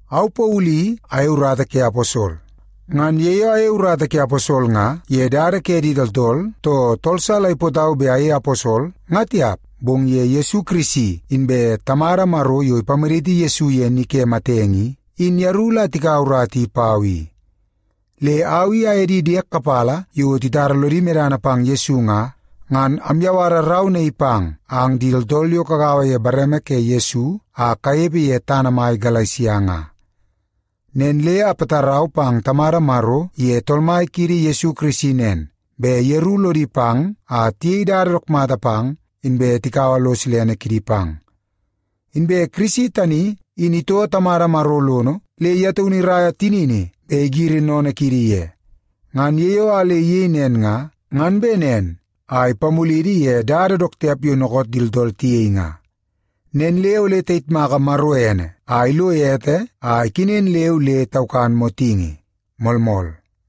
Au Paulu i ayei urata ke aposol. Ngan ye yo ayei urata ke aposol nga ye dada ke di tooltool, too tool sa la ipootau bet ayei aposol nga tiap, bong ye Yesu Kirisi inbe Tamada Maro yo ipamaditi Yesu ye ni ke matenge i, in yeru la tikaua urata i pau i. Le au i aye di diek kapala yo titara lodi medana pang Yesu nga, ngan amyawara rau naii pang ang di tooltool yo kagaua ye bareme ke Yesu a kanepe ye tana mai Galesia nga. Nen le apatarau pang Tamada Maro iye Tool Mai kiidi Yesu Kirisi nen, bet yeru lodi pang a tiyei dada dook mata pang, inbe tikaua lo silene kidi pang. Inbe Kirisi tani in itoo Tamada Maro lono le ye taunu iraia tinini bet igiri sennene kiidi ye. Ngan ye yo a le iyei nen nga, ngan bet nen a ipamulidi ye dada dook tiap yo dookoot di tooltool tiyei nga. Nen le ole tayitmaka Maro ene a ilo ete a ikenen leu le taukan motingi. Moolmool.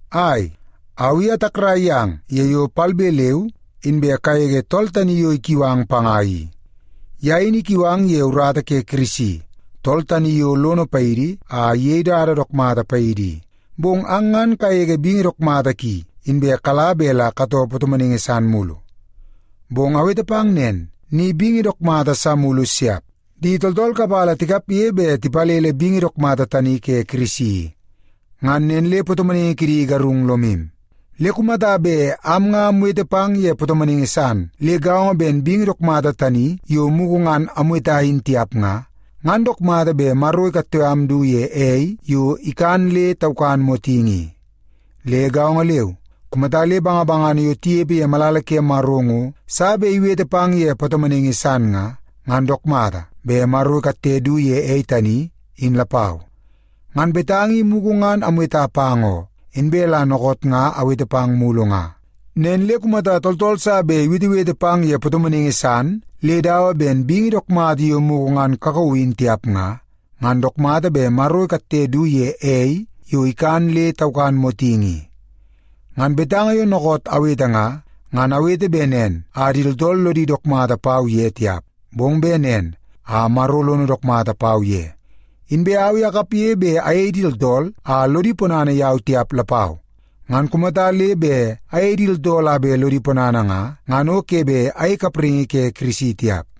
Ai, au i atakrai yang ye yo a le palbe leu inbe kagege tool tani yo ikiu ang panga i. Ye in ikiu ang ye urata ke Kirisi, tool tani yo lono paidi a iyei urata dook mata paidi i, bong ang ngan kagege bingi dook mata ki, inbe kala bet la katoo patomonaingi san mulu. Bong awete pang nen, ni bingi dook mata sa mulu siap. Di tooltool kapala tikapge bet tipalele bingi dook mata tani ke Kirisi i. Ngan nen le patomonaingi kidi igarung lomu. Le kumata bet am nga amwete pang ye patomonaingi san le gaongo ben bingi dook mata tani yo mugu ngan amweta in tiap nga, ngan dook mata bet Maro ikatte am du ye ei yo ikan nen le taukan motingi i. Le gaongo leu, kumata le bangabangana yo tinepe ye malala ke Maro ngo sa bet iwete pang ye patomonaingi san nga, ngan dook mata bet Maro ikatte du ye ei tani, in lapau. Ngan betanga i mugu ngan amweta pang oo, inbe la dookoot nga aweta pang mulu nga. Nen le kumata tooltool sa bet iwetewete pang ye patomonaingi san le dawa ben bingi dook mata yo mugu ngan kakauu in tiap nga, ngan dook mata bet Maro ikatte du ye ei yo ikan nen le taukan motingi i. Ngan betanga yo dookoot awete nga, ngan awete bet nen a di tooltool lodi dook mata pau ye tiap, bong bet nen a Maro lono dook mata pau ye. Inbe au i akapge bet ayei di tooltool a lodi ponana yau tiap lapau. Ngan kumata le bet ayei di tooltool a bet lodi ponana nga, ngan o ke bet ayei kapraingi ke Kirisi tiap.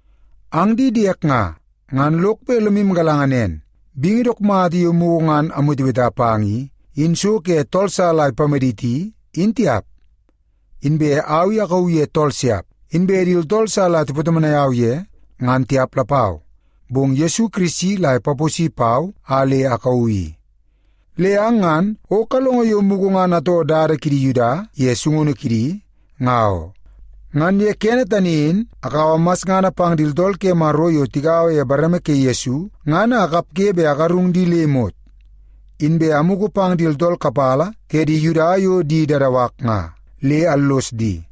Ang di diek nga, ngan lok bet lomu galanga nen, bingi dook mata yo mugu ngan amweteweta pang i, in so ke tool sa la ipamaditi in tiap. Inbe au i akauu ye tool siap. Inbe di tooltool sa la tipatomonai au ye, ngan tiap lapau. Bong Yesu Kirisi la ipaposi pau a le akauu i. Le ang ngan o kalongo yo mugu ngan atoo dada kidi Yuda ye sungunu kidi, ngan oo. Ngan ye kene tani in akaua masngana pang di tooltool ke Maro yo tigaua ye bareme ke Yesu nga, ngan a akapge bet agarung di le imot. Inbe amugu pang di tooltool kapala ke di Yuda yo di dadawak nga, le allos di.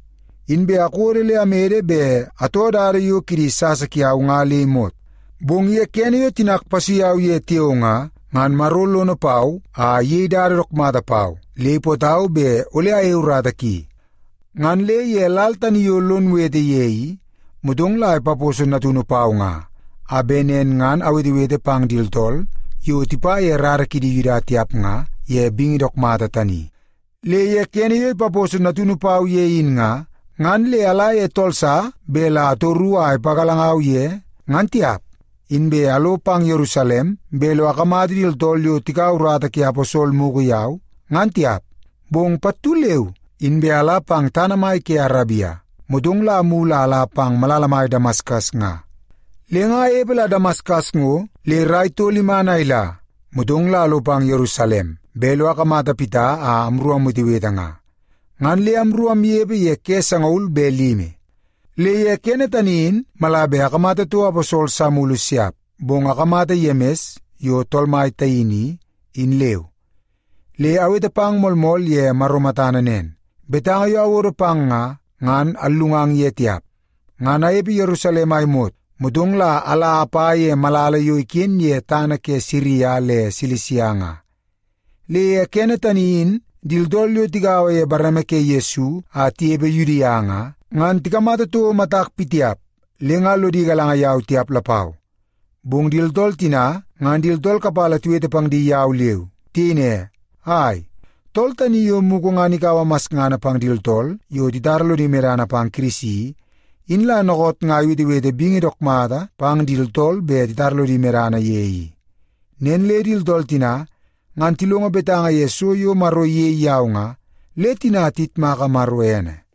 Inbe akodo le amede bet atoo dada yo kidi sasa kiau nga le imot. Bong ye kene yo tinak ipasui au ye tiao nga, ngan Maro lono pau a iyei dada dook mata pau le ipootau bet ole ayei urata ki. Ngan le ye lal tani yo lon wete ye i, motong la ipaposo Natunu pau nga, a bet nen ngan awetewete pang di tooltool yo tipa ye rara kidi Yuda tiap nga ye bingi dook mata tani. Le ye kene yo ipaposo Natunu pau ye in nga, ngan le ala ye tool sa bet la atoru a ipagalangau ye ngan tiap. Inbe alo pang Yerusalem bet lo akamata di tooltool yo tikaua urata ke aposol mugu yau, ngan tiap. Bong pattu leu inbe ala pang tana mai ke Arabia, motong la amulu a ala pang malala mai Damaskas nga. Le nga anepe la Damaskas ngo le rai tol iman a ila, motong la alo pang Yerusalem bet lo akamata Pita a amru awetewete nga. Ngan le amru amnepe ye ke sangaul be limi. Le ye kene tani in mala bet akamata toko aposol sa mulu siap, bong akamata Yemis yo Tool Mai taini i, in leu. Le awete pang moolmool ye Maro matana nen; betanga yo awodo pang nga, ngan allungang ye tiap. Ngan anepe Yerusalem a imot, motong la ala apa ye malala yo iken ye tana ke Siria le Silisia nga. Le ye kene tani in di tooltool yo tigaua ye bareme ke Yesu a tinepe Yudia nga, ngan tikamata toko matak pitiap le nga lodi galanga yau tiap lapau. Bong di tooltool tina ngan di tooltool kapala tiwete pang di yau leu. Tiyei ne, “Ai, tool tani yo mugu ngan ikaua masngana pang di tooltool yo titara lodi medana pang Kirisi i, in la dookoot nga iwetewete bingi dook mata pang di tooltool bet titara lodi medana ye i.” Nen le di tooltool tina, ngan tilongo betanga ye so yo Maro iyei yau nga, le tina tiyitmaka Maro ene.